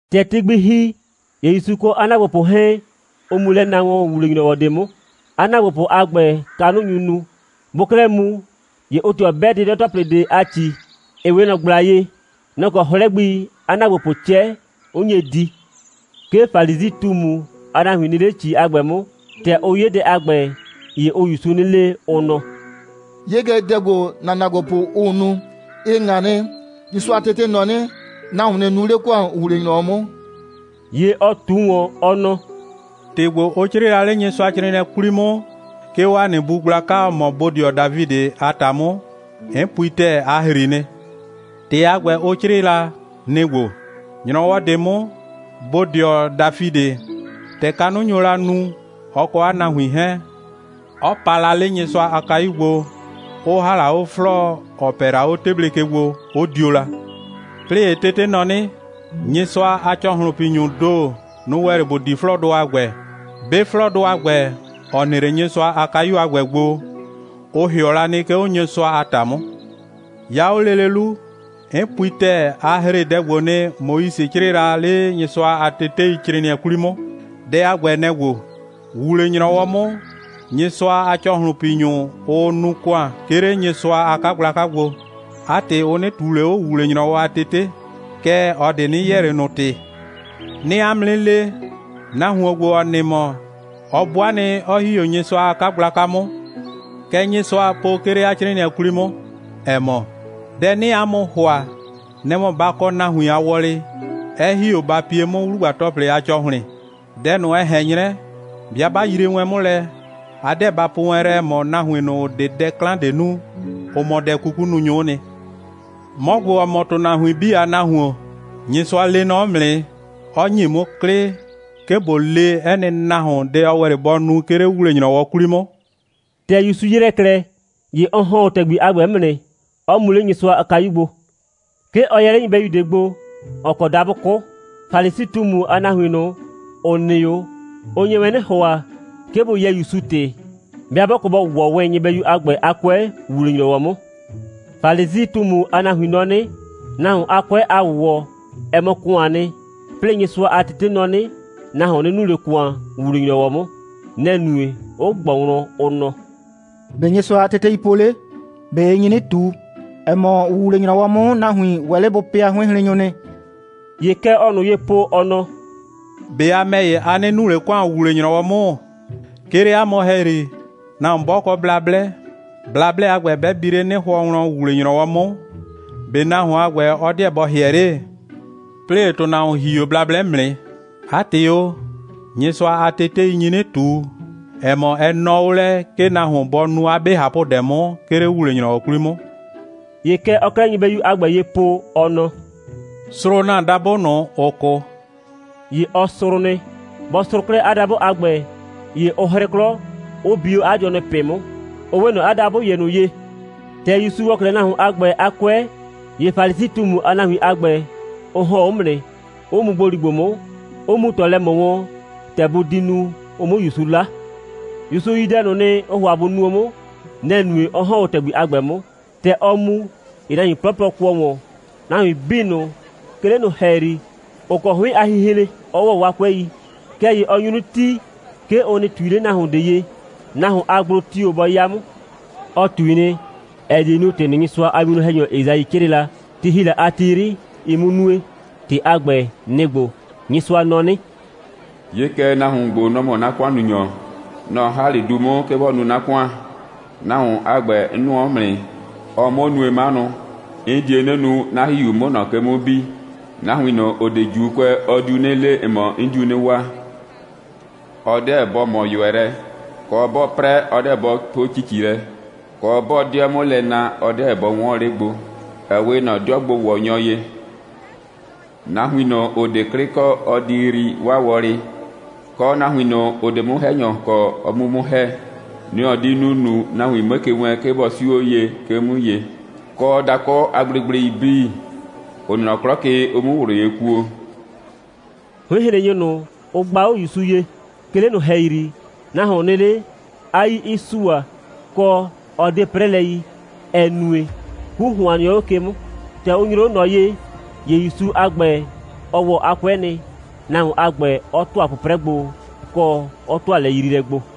‑Tɛ ti gbi ‑hi, ‑ye ‑Yusu kɔ 'a ‑naagbopʋ 'hɛɛn, ʋ mu lɛ na wɔn ‑wuwle‑nyrɔwɔ ꞊de 'mʋ. 'A ‑naagbopʋ a ‑gbɛ, kanʋ nyu nu. Bʋʋ 'klɛɛ mu, ‑ye ʋʋ ꞊tɩɔ 'bɛ 'dɩdɔ‑tɔplɩ ꞊de a ‑ci, ‑ɩ 'we ꞊nɔ ꞊gbla ye. Nɔ‑ kɔ 'hlɛ gbi 'a ‑naagbopʋʋ 'cɛ, 'ʋ nye di. 'Ke Falisi꞊tumu a nahuin nɩ 'le ‑ci a ‑gbɛ 'mʋ. ‑Tɛ ʋ 'ye dɛ a ‑gbɛ, ‑ye ʋʋ ‑Yusu 'nɩ le, ʋ nɔ: «'Ye kɛ, dɛ ‑gbo, ‑na ‑naagbopʋ, ʋʋ nu, ɩ ꞊ŋa nɩ. Nyɩsʋa a tete nɔ 'nɩ: Nahuon nɩ nu 'le ‑kʋan ‑wuwle‑nyrɔwɔ 'mʋ.» ‑Ye ɔ ꞊tu ꞊wɔn, ɔ nɔ: «‑Tɩ ‑gbo, ʋ 'crɩɩ la 'le Nyɩsʋacrɩɩnɩɛ 'kwli 'mʋ, 'ke 'o ‑a nɩ bu gblaka, ‑ɔ mɔ bodɩɔ Dafidɩ a ‑ta 'mʋ, 'n pui ‑tɛɛ, a ‑hri nɩ. ‑Tɩ a ‑gbɛ, ʋ 'crɩɩ la, nɩ‑ ‑gbo: ‑Nyrɔwɔ ꞊de 'mʋ bodɩɔ Dafidɩ, ‑tɛ kanʋ nyo la nu, ɔ kɔ 'a nahuin 'hɛɛn, 'ɔ pa la 'le Nyɩsʋa a kayu gbo, 'ʋ ‑ha la 'o 'flɔɔ, ‑ɔ pɛ la 'o 'teble ke gbo, 'ʋ dio la. 'Plɩɩ ‑ye tete nɔ 'nɩ, Nyɩsʋa a ‑cɔhlʋnpinyʋʋ ‑do, nʋ‑ ‑wɛ 'le ‑bʋ di 'flɔɔdʋ a ‑gbɛ. 'Be 'flɔɔdʋ a ‑gbɛ, ‑ɔ nɩ 'le Nyɩsʋa a kayu a ‑gbɛ gbo, ʋ ‑hɩɔ la nɩ, 'ke 'o Nyɩsʋa a ‑ta 'mʋ. 'Ya 'o lele 'lu, 'n pui ‑tɛɛ, a ‑hre dɛ ‑gbo nɩ, Moise 'crɩɩ la 'le Nyɩsʋa a teteicrɩɩnɩɛ 'kwli 'mʋ. Dɛ a ‑gbɛ, nɛ‑ ‑gbo: ‑Wuwle‑nyrɔwɔ 'mʋ, Nyɩsʋa a ‑cɔhlʋnpinyʋ, ʋʋ nu ‑kʋan, 'ke 'le Nyɩsʋa a 'kagblaka gbo. 'A ‑tɩ, ʋ 'nɩ ꞊tuu ꞊le 'o ‑wuwle‑nyrɔwɔ a tete. Kɛɛ, ꞊ɔ ꞊de 'nɩ yɛɛ ꞊le ꞊nʋ ‑tɩ. 'Nɩɩ 'a mʋ 'nɩ le, nahuon ‑gbo, ‑ɔ nɩ mɔ, ɔ 'bʋa nɩ, 'ɔ ‑hi 'o Nyɩsʋa a 'kagblaka 'mʋ. Kɛ Nyɩsʋaa po, 'ke 'le 'a 'crɩɩnɩɛ 'kwli 'mʋ, ‑ɛ mɔ: Dɛ 'nɩɩ 'a mʋ ‑hʋa, nɛ‑ mɔ, ba kɔ nahuin a wɔlɩ, 'ɛ ‑hi 'o ba pie 'mʋ 'wlugba‑tɔplɩ a ‑cɔhlɩn. Dɛ ꞊nʋ, ɛ ꞊hɛn 'nyrɛ, 'bɩa 'ba yrie wɛn 'mʋ lɛ, a 'deɛ ba po wɛn lɛ, ‑ɛ mɔ, nahuin ꞊nʋ, ‑ʋ 'de dɛ 'klan ꞊de nu, ʋ mɔ dɛ'kukununyʋ'ʋ nɩ. 'Mɔ ‑gbo, ‑ɔ mɔ ‑tʋnahuin 'bii a Nahuon, Nyɩsʋa lee nɔ 'mʋ nɩ, 'ɔ ‑nye 'mʋ 'klɩ, 'ke ꞊bo le 'ɛ nɩ nahuon dɛ ɔ ‑wɛ 'le bɔ nu, 'ke 'le ‑wuwle‑nyrɔwɔ 'kwli 'mʋ.» ‑Tɛ ‑Yusu ‑yrɛ 'klɛɛ, ‑ye ɔ ‑hɔn 'o ‑tɛgbi a ‑gbɛ 'mʋ nɩ, 'ɔ mu 'le Nyɩsʋa a kayu gbo. 'Ke ɔ yɛ 'le nyɩbɛyu ꞊de gbo, ‑ɔ kɔ dabʋ 'kʋ. Falisi꞊tumu a nahuin ꞊nʋ, ‑ʋ nɩ 'o, ʋ nye wɛn 'nɩ ‑hʋa, 'ke bʋ yɛɛ ‑Yusu ‑tɩ, 'bɩa 'bɔ kɔ bɔ ‑wɔ wɛn nyɩbɛyu a ‑gbɛ a 'kʋɛ ‑wuwle‑nyrɔwɔ 'mʋ. (Falisi꞊tumu a nahuin nɔ 'nɩ, nahuon a 'kʋɛ a ‑wʋwɔ, ɛ mɔ ‑kʋaan nɩ. 'Plɩɩ Nyɩsʋa a tete nɔ 'nɩ, nahuon nɩ nu 'le ‑kʋan ‑wuwle‑nyrɔwɔ 'mʋ.) Nɛ‑ nue, 'ʋ ꞊gbɔ wlɔn, ʋ nɔ: «‑Be' Nyɩsʋa a tetei po 'le? ꞊Be ɩ nyi 'nɩ ꞊tu, ‑ɛ mɔ, ‑wuwle‑nyrɔwɔ 'mʋ, nahuin ‑wɛ 'le bʋ pɩa 'hʋɩnhrennyʋ nɩ?» ‑Ye kɛ ɔɔ ꞊nʋ ye po, ɔ nɔ: «꞊Be a ‑mɛ ‑ye, a 'nɩ nu ꞊le ‑kʋan, ‑wuwle‑nyrɔwɔ 'mʋ? 'Ke 'le 'a mʋ ‑hɛyri, nahuon 'bɔ kɔ blablɛ, blablɛ a ‑gbɛ 'bɛ bi 'le 'nɩhʋɔ wlɔn ‑wuwle‑nyrɔwɔ 'mʋ, ꞊be nahuon a ‑gbɛ, ɔ 'deɛ bɔ ‑hɩɛ 'le? 'Plɩɩ ‑ye ‑tʋnahuon ‑hi 'o blablɛ 'mʋ nɩ. 'A ‑tɩ o, Nyɩsʋa a tetei nyi 'nɩ ꞊tu, ‑ɛ mɔ, ɛ nɔɔ 'o lɛ, 'ke nahuon bɔ nu 'a 'be ꞊hapʋdɛ 'mʋ, 'ke 'le ‑wuwle‑nyrɔwɔ 'kwli 'mʋ.» ‑Ye kɛ ɔɔ 'klɛɛ nyɩbɛyu a ‑gbɛ ye po, ɔ nɔ: «Srʋʋ ‑na dabʋ ꞊nʋ, ‑ʋ 'kʋ!» ‑Ye ɔ srʋʋ nɩ. Bɔ srʋʋ 'klɛɛ 'a dabʋ a ‑gbɛ, ‑ye ʋ 'hrɩ 'klɔ, 'ʋ bi 'o 'a dɩɔnʋ ꞊pɩ 'mʋ, ʋ 'we ꞊nɔ 'a dabʋ ‑ye ꞊nʋ ye. ‑Tɛ ‑Yusu ‑wɔ 'klɛɛ nahuon a ‑gbɛ a 'kʋɛ, ‑ye Falisi꞊tumu a nahuin a ‑gbɛ, ʋ ‑hɔn 'o 'mʋ nɩ, 'ʋ mu ‑gboligbo 'mʋ, 'ʋ mu ꞊tɔ lɛ ꞊mɔ wɔn, ‑tɛ bʋ di nu, ʋ 'mʋ ‑Yusu 'la. ‑Yusu yi dɛ ꞊nʋ nɩ, ʋʋ ‑hʋa bʋ nuo 'mʋ. Nɛ‑ nue, 'ɔ ‑hɔn 'o ‑tɛgbi a ‑gbɛ 'mʋ. ‑Tɛ ɔɔ mu, ‑ye nahuin 'plɔplɔ kʋɔ ‑wɔn, nahuin 'bii ꞊nʋ, 'ke 'le ꞊nʋ ‑hɛyri, ‑ʋ kɔ 'hʋɩn a hinhren, 'ɔ ‑wɔ 'waa 'kʋɛi. Kɛɛ ‑ye ɔ nyu 'nɩ tii, 'ke ʋ nɩ ꞊tui 'le nahuon ꞊de ye, nahuon a gblo tio‑ bɔ 'ya 'mʋ. Ɔ ꞊tui nɩ, ‑ɛ die nu, ‑tɩ ꞊nʋ, Nyɩsʋa a winwlɔn‑hɛnyɔ Esai 'crɩɩ la, ti ‑hi la a ti 'yri, ɩ 'mʋ nue. ‑Tɩ a ‑gbɛ, nɩ‑ ‑gbo: «Nyɩsʋa nɔ 'nɩ: 'Ye kɛ, nahuon ‑gbo, nɔ‑ mɔ 'na ‑kʋannunyɔ. Nɔ‑ 'n ‑ha 'le du 'mʋ, 'ke bɔ nu 'na ‑kʋan. Nahuon a ‑gbɛ, 'n nʋɔ 'mʋ nɩ, 'ɔɔ 'mʋ nue 'manʋ. 'N die 'nɩ nu, 'na ‑Hihiu 'mʋ 'o ꞊nɔ ke 'mʋ bi. Nahuin ꞊nʋ, ‑ʋ 'de ‑Juukʋɛ, ɔ diu 'nɩ le, ‑ɛ mɔ, 'n diu 'nɩ waa. Ɔ 'deɛ bɔ ꞊mɔ ꞊yʋɛ lɛ, kɔ, 'bɔɔ 'prɛ, ɔ 'deɛ bɔ po ‑cici lɛ, kɔ, 'bɔɔ 'dɩɛ 'mʋ lɛ na, ɔ 'deɛ bɔ 'wɔɔn 'le gbo, ‑ɛ 'we ꞊nɔ 'dɩɔgbo‑wɔnyɔ ye. Nahuin ꞊nʋ, ‑ʋ 'de 'klɩ kɔ, ɔ di yrii 'waa wɔlɩ, kɔ, nahuin ꞊nʋ, ‑ʋ 'de 'mʋ‑hɛnyɔ kɔ, ɔ 'mu 'mʋ ‑hɛ. Nɛ‑ ɔ di nu ‑nunu, nahuin 'mue ke wɛɛn, 'ke bɔ 'siu 'o ye, 'ke 'o 'mʋ ye, kɔ, dakʋ a gblegblei 'bii, ‑ʋ nɩ nɔ 'klɔ ke, ʋ 'muo ꞊wlʋ ye kuo.» 'Hʋɩnhrennyʋ ꞊nʋ, ʋ gba 'o ‑Yusu ye, 'ke 'le ꞊nʋ ‑hɛyri, nahuon nɩ 'le, 'a 'yii 'ɩ sua, kɔ, 'ɔ 'de 'prɛlɛ yi, ‑ɛ nue, 'ku ‑hʋan nɩɔ 'o ke 'mʋ. ‑Tɛ ʋ nyroo 'o ꞊nɔ ye, ‑ye ‑Yusu a ‑gbɛ, ɔ ‑wɔ 'a 'kʋɛ nɩ, nahuon a ‑gbɛ 'ɔ ‑tʋa 'pʋprɛ gbo, kɔ, 'ɔ ‑tʋa lɛyriilɛ gbo.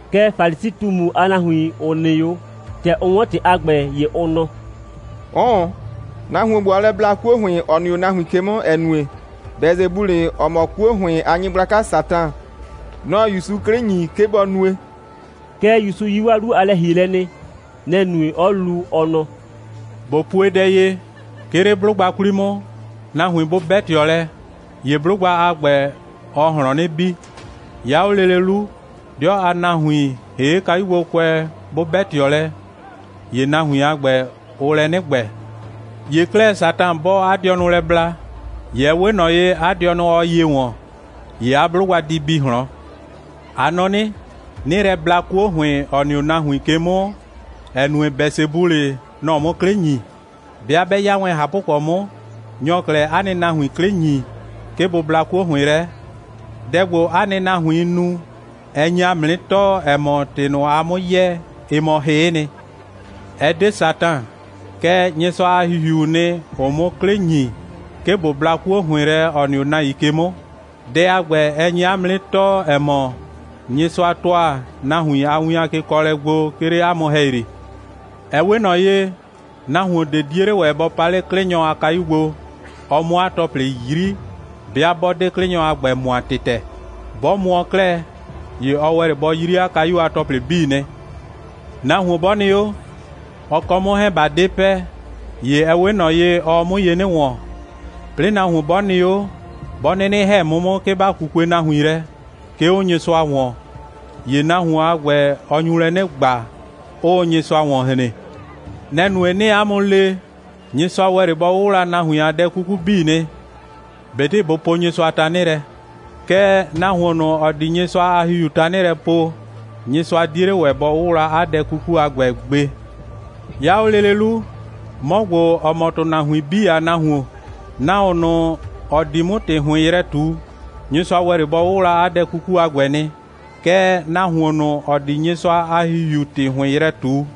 Kɛɛ, Falisi꞊tumu a nahuin, ‑ʋ nɩ 'o, ‑tɛ ʋ 'wɔn ‑tɩ a ‑gbɛ, ‑ye ʋ nɔ: «'Ʋʋn. Nahuon ‑gbo, ɔɔ lɛ bla 'kuo ‑hʋɩn ꞊nʋ, ‑ɔ nɩ 'o nahuin ke 'mʋ, ‑ɛ nue, Bɛsebulɩ, ‑ɔ mɔ 'kuo ‑hʋɩn a nyɩgblaka Satan, nɔ‑ɔ ‑Yusu 'klɩ ‑nyi, 'ke bɔ nue.» Kɛɛ, ‑Yusu yi 'waa 'lu a lɛ‑hielɛ nɩ. Nɛ‑ nue, 'ɔ lu, ɔ nɔ: «꞊Bo pue dɛ ye: 'Ke 'le 'blʋgba 'kwli 'mʋ, nahuin 'bʋ 'bɛ ꞊tɩɔ lɛ, ‑ye 'blʋgba a ‑gbɛ, ɔɔ ꞊hlɔn 'nɩ bi. 'Ya 'o lele 'lu, 'dɩɔ a nahuin, ‑hee' kayugbokʋɛ, 'bʋ 'bɛ ꞊tɩɔ lɛ, ‑ye nahuin a ‑gbɛ, ʋʋ lɛ 'nɩ ‑gbɛ. ‑Ye 'klɛɛ, Satan 'bɔɔ 'a dɩɔnʋ lɛ bla, ‑ye ɛ 'we ꞊nɔ ye, 'a dɩɔnʋ ɔɔ ye ‑wɔn. ‑Ye 'a 'blʋgba di bi ꞊hlɔn. A nɔ 'nɩ, 'nɩɩ lɛ bla 'kuo ‑hʋɩn, ‑ɔ nɩ 'o nahuin ke 'mʋ, ‑ɛ nue, Bɛsebulɩ, nɔ‑ɔ 'mʋ 'klɩ ‑nyi. 'Bɩa 'bɛ 'ya wɛn ꞊hapʋkɔ 'mʋ, nyɔ‑ɔ 'klɛɛ 'a nɩ nahuin 'klɩ ‑nyi 'le, 'ke bʋ bla 'kuo ‑hʋɩn lɛ? Dɛ ‑gbo, 'a nɩ nahuiin nu, ɛ nye ‑a mʋ 'nɩ tɔɔ, ‑ɛ mɔ, ‑tɩ ꞊nʋ, aa 'mʋ yɛɛ, ɩ mɔ hɩ'ɩ nɩ. Ɛ 'de Satan, kɛɛ, Nyɩsʋa a ‑Hihiuu nɩ, ‑ʋʋ 'mʋ 'klɩ ‑nyi, 'ke ꞊bo bla 'kuo ‑hʋɩn lɛ, ‑ɔ nɩ 'o nahuin ke 'mʋ. Dɛ a ‑gbɛ, ɛ nye 'a mʋ 'nɩ tɔɔ, ‑ɛ mɔ, Nyɩsʋa ‑tʋa nahuin a win a kekɔɔlɛ gbo, 'ke 'le 'a mʋ ‑hɛyri. Ɛ 'we ꞊nɔ ye, nahuon ꞊de 'die 'le ‑wɛ bɔ pa 'le 'klɩnyɔ a kayu gbo, ɔ 'mʋ 'a ‑tɔplɩ 'yri, 'bɩa 'bɔ 'de 'klɩnyɔ a ‑gbɛ mʋa ‑tɩtɛ. 'Bɔ mʋɔ 'klɛɛ, ‑ye ɔ ‑wɛ 'le bɔ 'yri 'a kayu a ‑tɔplɩ 'bii nɩ. Nahuon 'bɔ nɩ 'o, ɔ kɔ 'mʋ 'hɛɛn, ꞊ba 'de pɛ, ‑ye ɛ 'we ꞊nɔ ye, ɔɔ 'mʋ ye 'nɩ ‑wɔn. 'Plɩɩ nahuon 'bɔ nɩ 'o, 'bɔ 'nɩnɩ ‑hɛ 'mʋ 'mʋ, 'ke ‑ba 'kukue nahuin lɛ, 'ke 'o Nyɩsʋa ‑wɔn, ‑ye nahuon a ‑gbɛ, ɔ nyu lɛ 'nɩ ‑gba, 'ʋʋ Nyɩsʋa ‑wɔn hren. Nɛ‑ nue, 'nɩɩ 'a mʋ le, Nyɩsʋa ‑wɛ 'le bɔ 'wʋwla nahuin a dɛ 'kuku 'bii nɩ, ꞊betɩ bʋ poo Nyɩsʋa tanɩ lɛ. Kɛɛ, nahuon ꞊nʋ, ‑ɔ di Nyɩsʋa a ‑Hihiu tanɩ lɛ poo, Nyɩsʋa 'die 'le ‑wɛ bɔ 'wʋwla 'a dɛ 'kuku a ‑gbɛ gbe. 'Ya 'o lele 'lu, 'mɔ ‑gbo, ‑ɔ mɔ ‑tʋnahuin 'bii a Nahuon, nahuon ꞊nʋ, ‑ɔ di 'mʋ ‑tɩ ‑hʋɩn yrɛ ꞊tu, Nyɩsʋa ‑wɛ 'le bɔ 'wʋwla 'a dɛ 'kuku a ‑gbɛ nɩ. Kɛɛ, nahuon ꞊nʋ, ‑ɔ di Nyɩsʋa a ‑Hihiu ‑tɩ ‑hʋɩn yrɛ ꞊tu,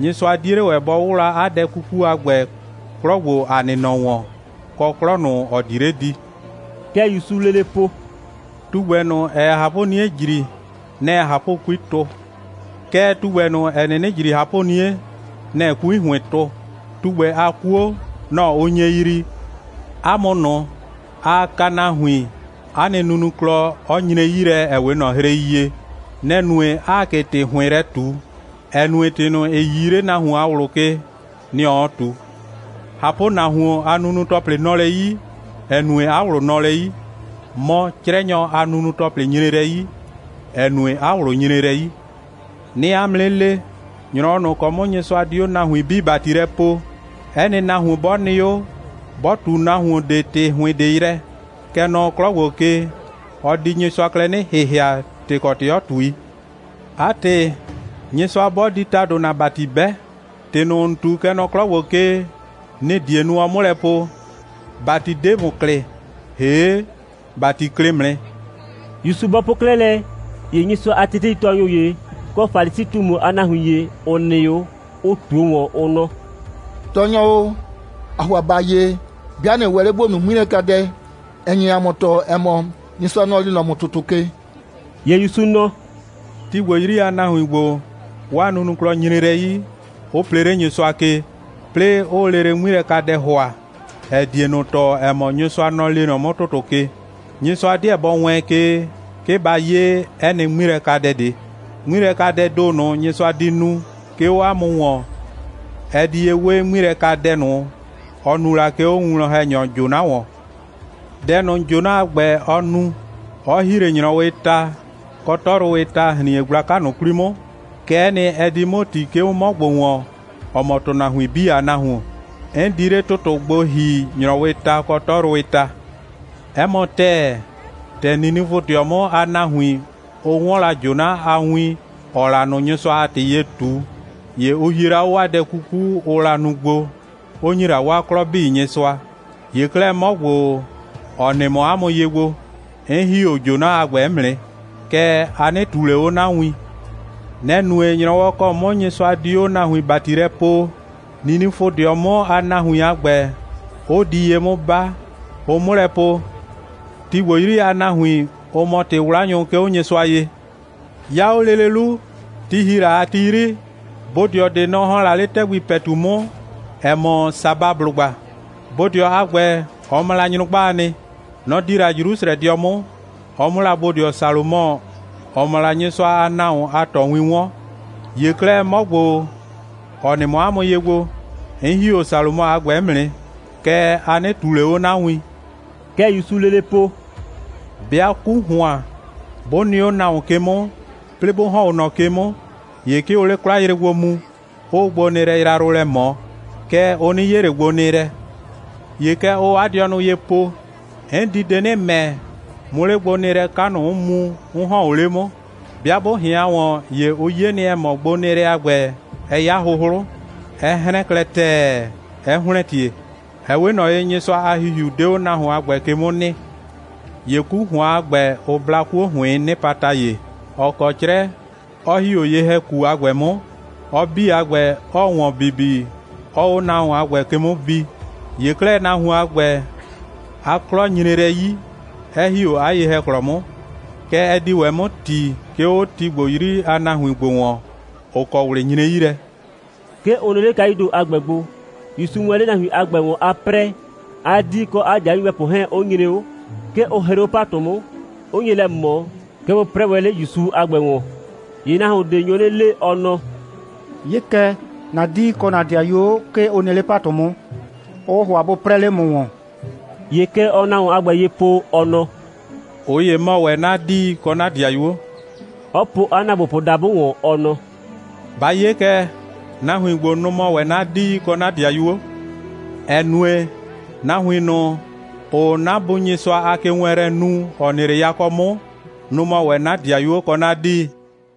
Nyɩsʋa 'die 'le ‑wɛ bɔ 'wʋwla 'a dɛ 'kuku a ‑gbɛ 'klɔ ‑gbo, ‑a nɩ nɔ ‑wɔn, kɔ 'klɔ ꞊nʋ, ‑ɔ di 'le di.» (Kɛ ‑Yusuu lele po:) «Tugbɛ ꞊nʋ, ‑ɛɛ ꞊hapʋ'nie ‑jri, nɛ‑ɛ ꞊hapʋ'kui tʋ. Kɛɛ, tugbɛ ꞊nʋ, ‑ɛ 'nɩnɩ ‑jri ꞊hapʋ'nie, nɛ‑ɛ 'kui ‑hʋɩn tʋ. Tugbɛ a 'kuo, nɔ‑ ʋ nye yrii. 'A mʋ ꞊nʋ, aa kaa nahuin, 'a nɩ nunuklɔ 'ɔ nyre 'yi lɛ, ‑ɛ 'we ꞊nɔ hrei ye. Nɛ‑ nue, 'aa ꞊ke ‑tɩ ‑hʋɩn lɛ ꞊tu, ‑ɛ nue, ‑tɩ ꞊nʋ, ‑ɩ 'yii 'le nahuon a ꞊wlʋ ke, nɩ‑ ɔɔ ꞊tu. ꞊Hapʋnahuon a nunu‑tɔplɩ nɔ lɛ 'yi, ‑ɛ nue, 'a ꞊wlʋ nɔ lɛ 'yi. Mɔ, 'crɛnyɔ a nunu‑tɔplɩ nyre lɛ 'yi, ‑ɛ nue, 'a ꞊wlʋ nyre lɛ 'yi. 'Nɩɩ 'a mʋ 'nɩ le, ‑nyrɔwɔ ꞊nʋ ‑kɔ 'mʋ Nyɩsʋa di 'o nahuin 'bii ‑bati lɛ poo, 'ɛ nɩ nahuon 'bɔ nɩ 'o, 'bɔ ꞊tu nahuon ꞊de ‑tɩ ‑hʋɩn ꞊de yrɛ, kɛ nɔ 'klɔ ‑gbo ke, ɔ di Nyɩsʋa klɛ 'nɩ ‑hɩhɩa, ‑tɩ kɔ ‑tɩ 'ɔ ꞊tui. 'A ‑tɩ, Nyɩsʋa 'bɔ di ‑tado ‑na ‑bati 'bɛ, ‑tɩ ꞊nʋ, ‑n ꞊tu, kɛ nɔ 'klɔ ‑gbo ke, nɩ‑ die nu, ɔ 'mʋ lɛ po: ‑Bati 'de ‑mʋ klɩ, ‑hee' ‑bati klɩ ‑mʋ nɩ.» ‑Yusu bɔ po 'klɛɛ lɛ, ‑ye Nyɩsʋa a teteitɔɔnyʋ ‑ye, kɔ Falisi꞊tumu a nahuin ‑ye, ‑ʋ nɩ 'o, ʋ ꞊tuo ‑wɔn, ʋ nɔ: «Tɔɔnyɔ o, ‑aa ‑hʋa ‑ba 'ye, 'bɩa ꞊nɩ ‑wɛ 'le ‑bo nu 'ŋmilɛkadɛ, ‑ɛ nye ‑a mʋ tɔɔ, ‑ɛ mɔ, Nyɩsʋa, nɔ‑ lee nɔ ‑mʋ ‑tʋtʋ ke.» ‑Ye ‑Yusu nɔ: «Ti ‑gbo 'yri a nahuin ‑gbo, 'waa nunuklɔ nyre lɛ 'yi, 'ʋ plee 'le Nyɩsʋa ke, 'plɩɩ 'ʋʋ lele 'ŋmilɛkadɛ ‑hʋa, ‑ɛ die ꞊nʋ tɔɔ, ‑ɛ mɔ, Nyɩsʋa, nɔ‑ lee nɔ 'mʋ ‑tʋtʋ ke. Nyɩsʋa 'deɛ bɔ wɛɛn ke, 'ke ba 'ye 'ɛ nɩ 'ŋmilɛkadɛ ꞊de. 'Ŋmilɛkadɛɛ ‑do ꞊nʋ, Nyɩsʋa di nu, 'ke 'o 'a mʋ ‑wɔn, ɛ di ye 'we 'ŋmilɛkadɛ ꞊nʋ, ɔ nu la, 'ke 'o 'a winwlɔn‑hɛnyɔ Jona ‑wɔn. Dɛ ꞊nʋ, Jona a ‑gbɛ, ɔ nu, 'ɔ ‑hi 'le ‑nyrɔwɩɩ ta kɔ 'tɔyrʋwɩɩ ta ‑hrin.e gblaka ꞊nʋ 'kwli 'mʋ, kɛ'ɛ nɩ, ɛ di 'mʋ ‑ti, 'ke 'o 'mɔ ‑gbo ‑wɔn, ‑ɔ mɔ ‑tʋnahuin 'bii a Nahuon. 'N di 'le ‑tʋtʋ gbo ‑hi ‑nyrɔwɩɩ ta kɔ 'tɔyrʋwɩɩ ta. 'Ɛ mɔ ‑tɛɛ, ‑tɛ Ninifʋdɩɔ 'mʋ a nahuin, ʋ 'wɔn la Jona a win, ‑ɔɔ la ꞊nʋ Nyɩsʋa a ‑tɩ ye ꞊tu, ‑ye ʋ hie la 'o 'waa dɛ 'kuku, ʋʋ la nu gbo, 'ʋ ‑nyi la 'waa 'klɔ 'bii Nyɩsʋa. ‑Ye 'klɛɛ, 'mɔ ‑gbo, ‑ɔ nɩ mɔ 'a mʋ ye gbo, 'n ‑hi 'o Jona a ‑gbɛ 'mʋ nɩ. Kɛɛ, a 'nɩ ꞊tuu ꞊le 'o 'na win. Nɛ‑ nue, ‑nyrɔwɔ ‑kɔ 'mʋ Nyɩsʋa di 'o nahuin ‑bati lɛ poo, Ninifʋdɩɔ 'mʋ a nahuin a ‑gbɛ 'ʋ di ye 'mʋ 'ba, ʋ 'mʋ lɛ po, ti ‑gbo 'yri a nahuin, ʋ mɔ ‑tɩ'wlanyʋ, 'ke 'o Nyɩsʋa ye. 'Ya 'o lele 'lu, ti ‑hi la a ti 'yri, bodɩɔ ꞊de, nɔ‑ ‑hɔn la 'le ‑tɛgbi ‑pɛtu 'mʋ, ‑ɛ mɔ Sabablʋgba. Bodɩɔ a ‑gbɛ, ɔ mɔ la nyrʋgbaa nɩ. Nɔ‑ di la Jrusrɛdɩɔ 'mʋ, ɔ 'mʋ la bodɩɔ Salomɔ, ‑ɔ mɔ la Nyɩsʋa a nahuon a ꞊tɔwin 'wɔn. ‑Ye 'klɛɛ, 'mɔ ‑gbo, ‑ɔ nɩ mɔ 'a mʋ ye gbo, 'n ‑hi 'o Salomɔ a ‑gbɛ 'mʋ nɩ. Kɛɛ, a 'nɩ ꞊tuu ꞊le 'o 'na win.» Kɛ ‑Yusuu lele po: «'Bɩa 'ku ‑hʋan, 'bʋ nɩ 'o nahuon ke 'mʋ, 'plɩɩ 'bʋ ‑hɔn 'o ꞊nɔ ke 'mʋ, ‑ye 'ke ʋʋ 'le 'kwlayre gbo mu, 'ʋʋ gbonɩɩlɛ yrayrʋ lɛ ꞊mɔ. Kɛɛ, ʋ 'nɩ 'ye ꞊le gbonɩɩlɛ. ‑Ye kɛ ʋʋ 'a dɩɔnʋ ye po: 'N di de 'nɩ ‑mɛ, 'mʋ 'le gbonɩɩlɛ 'ka ꞊nʋ 'mʋ mu, 'n ‑hɔn o 'le 'mʋ. 'Bɩa 'bʋ ꞊hɩan ‑wɔn, ‑ye ʋ 'ye nɩ, ‑ɛ mɔ, gbonɩɩlɛ a ‑gbɛ, ɛ 'ya 'hʋhlʋ, 'ɛ 'hrɛn klɛ ‑tɛɛ, 'ɛ ‑hlɛntie. (Ɛ 'we ꞊nɔ ye, Nyɩsʋa a ‑Hihiu 'de 'o nahuon a ‑gbɛ ke 'mʋ nɩ.) ‑Ye 'ku ‑hʋan a ‑gbɛ, ʋ bla 'kuo ‑hʋɩɩn 'nɩpata ‑ye, ‑ɔ kɔ 'crɛ, 'ɔ ‑hi 'o ye‑hɛku a ‑gbɛ 'mʋ, ɔ 'bii a ‑gbɛ, 'ɔɔ ‑wɔn bibi, 'ɔɔ 'o nahuon a ‑gbɛ ke 'mʋ bi. ‑Ye 'klɛɛ, nahuon a ‑gbɛ, 'a 'klɔ nyre lɛ 'yi, 'ɛ ‑hi 'o 'a ye‑hɛklɔ 'mʋ. Kɛ ɛ di ‑wɛ 'mʋ ‑ti, 'ke 'o ti ‑gbo 'yri a nahuin ‑gbo ‑wɔn, ‑ʋ kɔ ꞊wlɩ nyre 'yi lɛ.» 'Ke ʋ nɩ 'le kayuu ‑do a ‑gbɛ gbo. ‑Yusuu wɛn 'le nahuin a ‑gbɛ ‑wɔn a 'prɛɛ, 'a 'dii kɔ 'a 'dɩayuo nyɩbɛpʋ 'hɛɛn 'ʋ nyre 'o. 'Ke ʋ hree 'o ‑patʋ 'mʋ, 'ʋ nye lɛ ꞊mɔ, 'ke bʋ 'prɛɛ wɛn 'le ‑Yusu a ‑gbɛ ‑wɔn. ‑Ye nahuon ꞊de nyo 'nɩ le, ɔ nɔ: «'Ye kɛ, ‑na 'dii kɔ ‑na 'dɩayuo, 'ke ʋ nɩ 'le ‑patʋ 'mʋ, 'ʋʋ ‑hʋa bʋ 'prɛɛ 'le ‑mʋ ‑wɔn.» ‑Ye kɛ ɔɔ nahuon a ‑gbɛ ye po, ɔ nɔ: «꞊Ʋ ‑ye mɔ ‑wɛ 'na 'dii kɔ 'na ‑dɩayuo,» 'ɔ po 'a ‑naagbopʋ dabʋ ‑wɔn, ɔ nɔ: «Ba 'ye kɛ, nahuin ‑gbo, nʋ‑ mɔ ‑wɛ 'na 'dii kɔ 'na 'dɩayuo. ‑Ɛ nue, nahuin ꞊nʋ, ‑ʋʋ 'na Bu Nyɩsʋa a kewɛɛnlɛ nu, ‑ɔ nɩ 'le yakɔ 'mʋ, nʋ‑ mɔ ‑wɛ 'na 'dɩayuo kɔ 'na 'dii.»